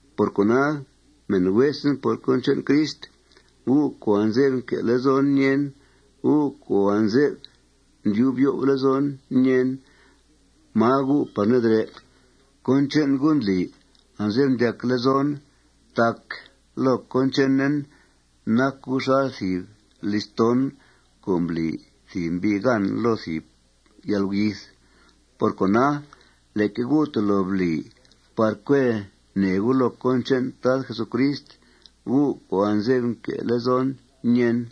Por cona, mèn huesen por cón che'n Crist, gu' co' anze'f nque' lezon ñèen, gu' co' anze'f ndyub yo'f lezon ñèen máa gu' par nedrè', cón che'n gu' ndli anze'f ndyac lezon. Tac loo cón chenen, nac gu' xal thìb listón co' mbli thìb mbi' gan loo thìb yalguyith. Por cona, leque gu' tolo bli par cue nèe gu' loo cón che'n Tad Jesucrist, gu' co' anze'f nque' lezon ñèen.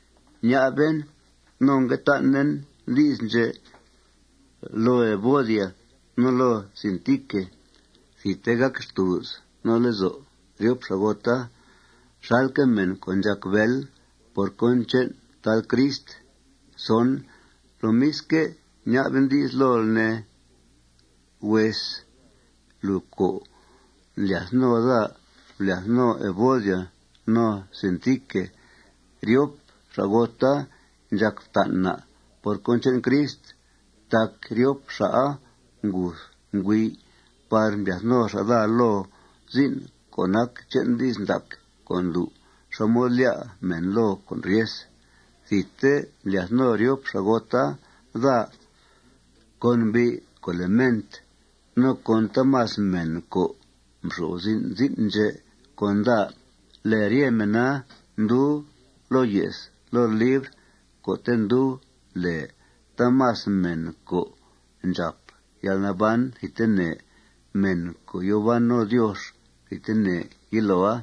Ña'ben no ngue tan'en di's ndxè' loo Evodia no loo Síntique. Thidte gàc xtùuz no lezo' ryop xa'gota xalque' mèn co' ndxàc bél por cón che'n Tad Crist. Lomisque', ña'ben di's lool, ne, hues, lùu co' ndlyath no daa, blyath no Evodia no Síntique. Ryop xa'gota ndxàc fta'n na' por cón che'n Crist. Tac ryop xa'a nguth nguey' par mblyath no xa' daa loo zin' co' nac che'n di's ndac co' ndlu' xá mod lyá' mèn loo con' ryes. Thidte mblyath no ryop xa'gota daa con mbi' co' lèe Ment, no con taamas mèn co' nxo'f zin' zin' ndxè' con daa. Lèe rye mèna ndub loo ye's loo libr co'te' ndub lèe taamas mèn co' ndxàp yalnaban thidtene, mèn co' yòo ban no Diox thidtene yiloa.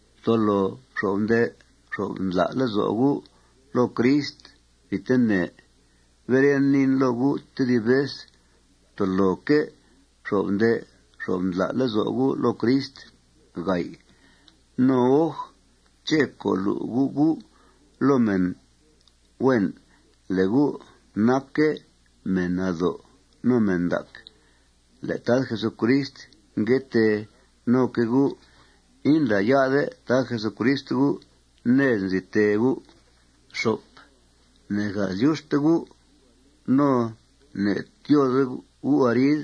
Ftolo fxo'f nde' fxo'f ndla' lezo' gu' loo Crist thidtene. Beren, niin loo gu' tedib vez: Ftoloque' fxo'f nde' fxo'f ndla' lezo' gu' loo Crist. No oj ché' co' lu' gu' gu' loo mèn, huen, le' gu' nacque' mèn nado' no mèn ndac. Le' Tad Jesucrist ngue tee noque' gu'. Indlá'ya'de Tad Jesucrist gu' ned nzi tee gu'. Ne'gath lyuxte gu' no ne'tyóode gu' arid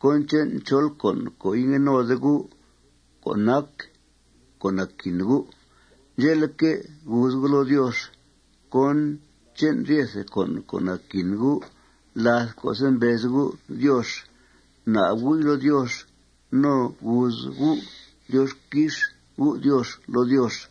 cón che'n chol con' co' ingue node gu' co' nac co' naquin gu'. Ndxe'leque', guuz gu' loo Diox cón che'n ryete con' co' naquin gu' láth co'se' mbez gu' Diox. Bna'b gu'i loo Diox no guuz gu: Diox quix U', Diox, loo Diox.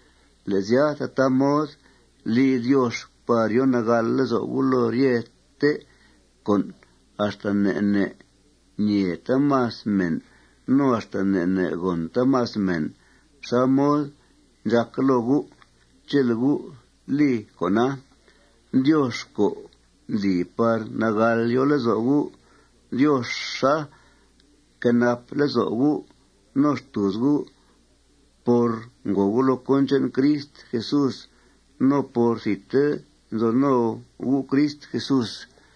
Le' sya, tataa mod li Diox par yo nagàl lezo' gu' loo ryete con' axta ne' ne' ñee taamas mèn no axta ne' ne' gòn taamas mèn xá mod ndxàca loo gu'. Chele' gu' li con'a, Diox co' ndli par nagàl yo lezo' gu', Dioxa quenap lezo' gu' no xtùuz gu' por ngòo gu' loo cón che'n Crist Jesús no por thidte nzo no gu' Crist Jesús.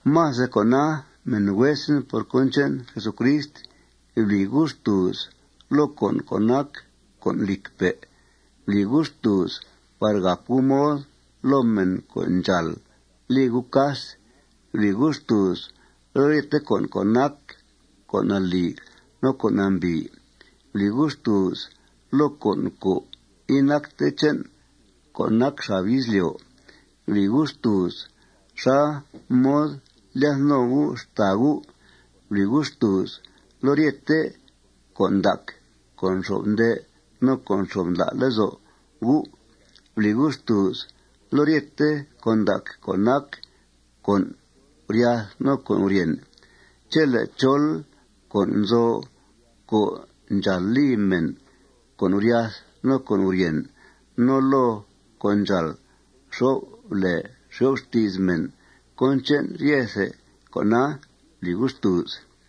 Más de cona, mèn huesen por cón che'n Jesucrist, bli gu' xtùuz loo con' co' nac con' lìcpe'. Bli gu' xtùuz par gàp gu' mod loo mèn co' ndxàal li gu' cas. Bli gu' xtùuz loo ryete con' co' nac con' nalì no con' nambìi. Bli gu' xtùuz loo con' co' inacte che'n co' nac xab izlyo'. Bli gu' xtùuz xá mod lyath no gu' xtàa gu'. Bli gu' xtùuz loo ryete con' ndac co' nxo'f nde' no co' nxo'f ndla' lezo' gu'. Bli gu' xtùuz loo ryete con' ndac co' nac con' guryath no con' guryèn. Chele' chol con' nzo co' ndxàal li mèn con' guryath no con' guryèn no loo co' ndxàal xo'f lèe xo'f xti's mèn, cón che'n ryethe con'a bli gu' xtùuz.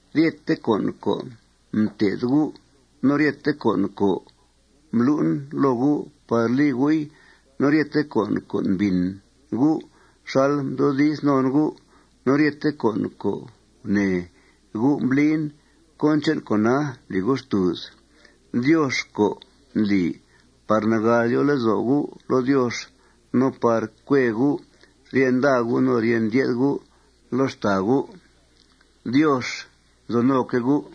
Ryete con' co' mté'then gu', no ryete con' co' mblu'en loo gu' par li gu'i, no ryete con' co' mbìn gu' xal ndyoodiz non gu', no ryete con' co' gunèe gu' mblin, cón che'n con'a bli gu' xtùuz. Diox co' ndli par nagàl yo lezo' gu' loo Diox no par cue gu' rye nda gu' no rye ndye'th gu' loo xtàa gu', Diox nzo noque' gu'.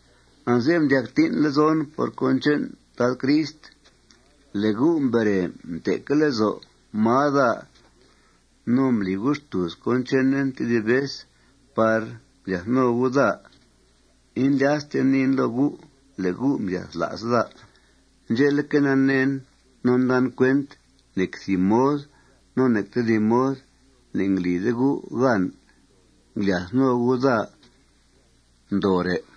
Anze'f ndyac tín' lezon por cón che'n Tad Crist le' gu' mbere mte'que' lezo' máa daa no mbli gu' xtùuz cón chenen tedib vez par mblyath no gu' daa. Indlyasten niin loo gu' le' gu' mbyathla's daa. Ndxe'leque', naneen no ndan cuent nec thìb mod no nec tedib mod ne'nglide gu' gan nglyath no gu' daa ndoore'.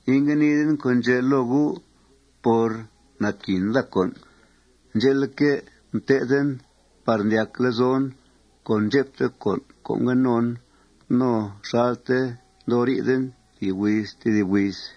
Ingue niiden con' ndxè' loo gu' por naquin daa con'. Ndxe'leque', mtéthen par ndyac lezon con ndxepte con' co' ngue non no xalte ndoo riiden thìb huiz tedib huiz.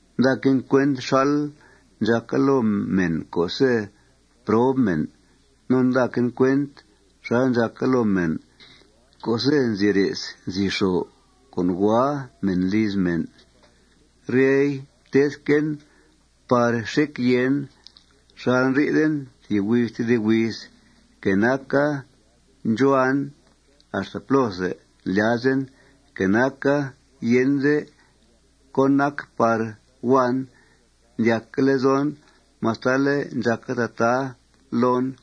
Ndaquen cuent xal ndxàca loo mèn co'se' prob mèn. No ndaquen cuent xal ndxàca loo mèn co'se' nzi re's nzi xo con' hua mèn liz mèn. Ryei mtéthquen par xec yèen xal ndri'then thìb huiz tedib huiz. Que naca ndxuhuan axta plóthe ndlyazen, que naca yende cón nac par huan, ndyacque' lezon mastale' ndxàca tataa loon.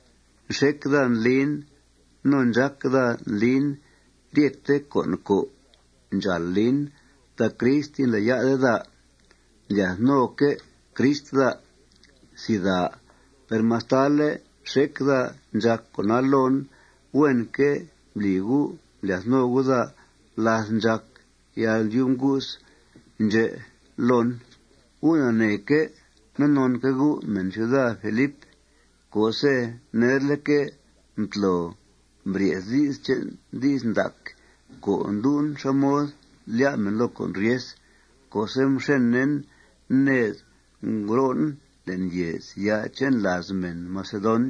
Nxec daa ndlin no ndxác daa ndlin ryete con' co' ndxàal lin tac Crist indlá'ya'de daa. Ndlyath noque' Crist daa. Per mastale' nxec daa ndxàc con'a loon, huenque' mbli gu' mblyath no gu' daa láth ndxàc yalndyub ngu's ndxè' loon. Gu' naneeque' no nonque' gu', mèn ciuda Filip, co'se' nerleque' mtlo mbrye's di's che'n di's ndac co' ndlu' xá mod lyá' mèn loo con' ryes co'se' mxenen ned ngro'en le'n yèezya' che'n làaz mèn macedon,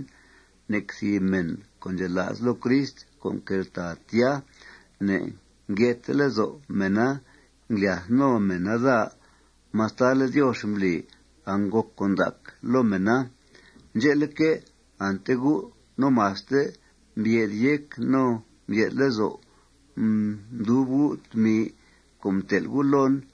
nec thìb mèn co' ndxela's loo Crist co' nqueltàa tya ne'ngye'thte lezo' mèna nglyath no mèna daa mastale' Diox mbli angngòc con' ndac loo mèna. Ndxe'leque', ante gu' no maste mbye'th yéc no mbye'th lezo' mdub gu' tmi co' mtel' gu' loon.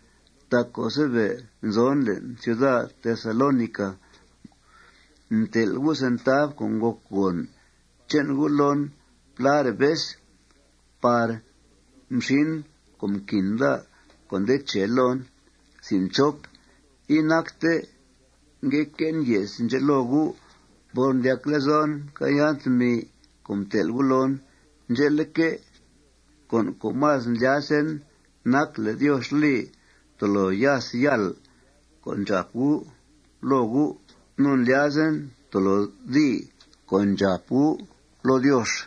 Tac co'se' be' nzon le'n ciuda Tesalónica, mtel' gu' centav co' ngòc gòn che'n gu' loon pláre' vez par mxin con' mquin daa co' nde che loon. Inacte ngue que'en ye's ndxè' loo gu' por ndyac lezon mcàayan tmi co' mtel' gu' loon. Ndxe'leque', con' co' más ndlyazen nac le' Diox li tolo yas yàl con' ndxàp gu' loo gu'. No ndlyazen tolo dii con' ndxàp gu' loo Diox.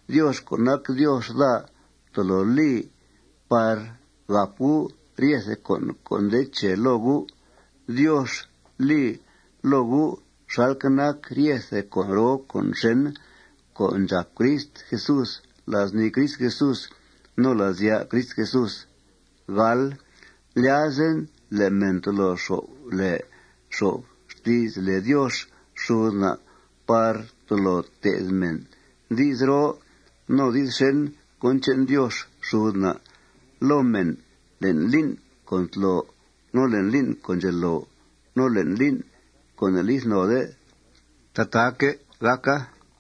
Diox co' nac Diox daa tolo li par gàp gu' ryethe con' co' nde che loo gu'. Diox lii loo gu' xalque' nac ryethe con' roo con' xèn co' ndxàp Crist Jesús la's nii Crist Jesús no la's ya' Crist Jesús. Ndlyazen le' mèn tolo xo'f lèe xo'f xti's lèe Diox xud na' no tolo te'th mèn di's roo di's xèn cón che'n Diox xud na' loo mèn le'n lín' co' ntlo, no le'n lín' co' ndxelo, no le'n lín' co' ne'lith node. Tataaque' gàca.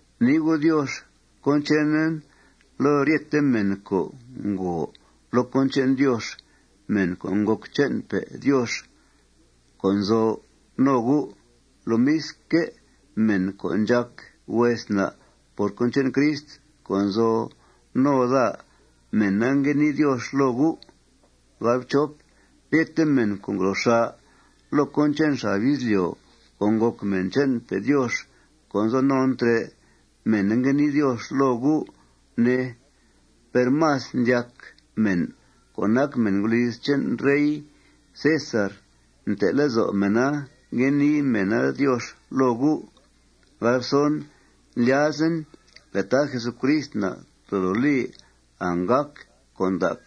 Gunii gu' Diox cón chenen loo ryete mèn co' ngòo loo cón che'n Diox, mèn co' ngòc che'npe' Diox co' nzo no gu'. Lomisque', mèn co' ndxàc hues na' por cón che'n Crist co' nzo no daa, mèna ngue nii Diox loo gu'. Ryete mèn co' ngro xà' loo cón che'n xab izlyo' co' ngòc mèn che'npe' Diox co' nzo non trè', mèna ngue nii Diox loo gu', ne. Per más ndyac mèn co' nac mèn guliz che'n rey César, nte' lezo' mèna ngue nii mèna Diox loo gu'. Ndlyazen le' Tad Jesucrist na' tolo li anggàc con' ndac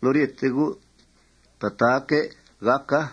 loo ryete gu'. Tataaque' gàca.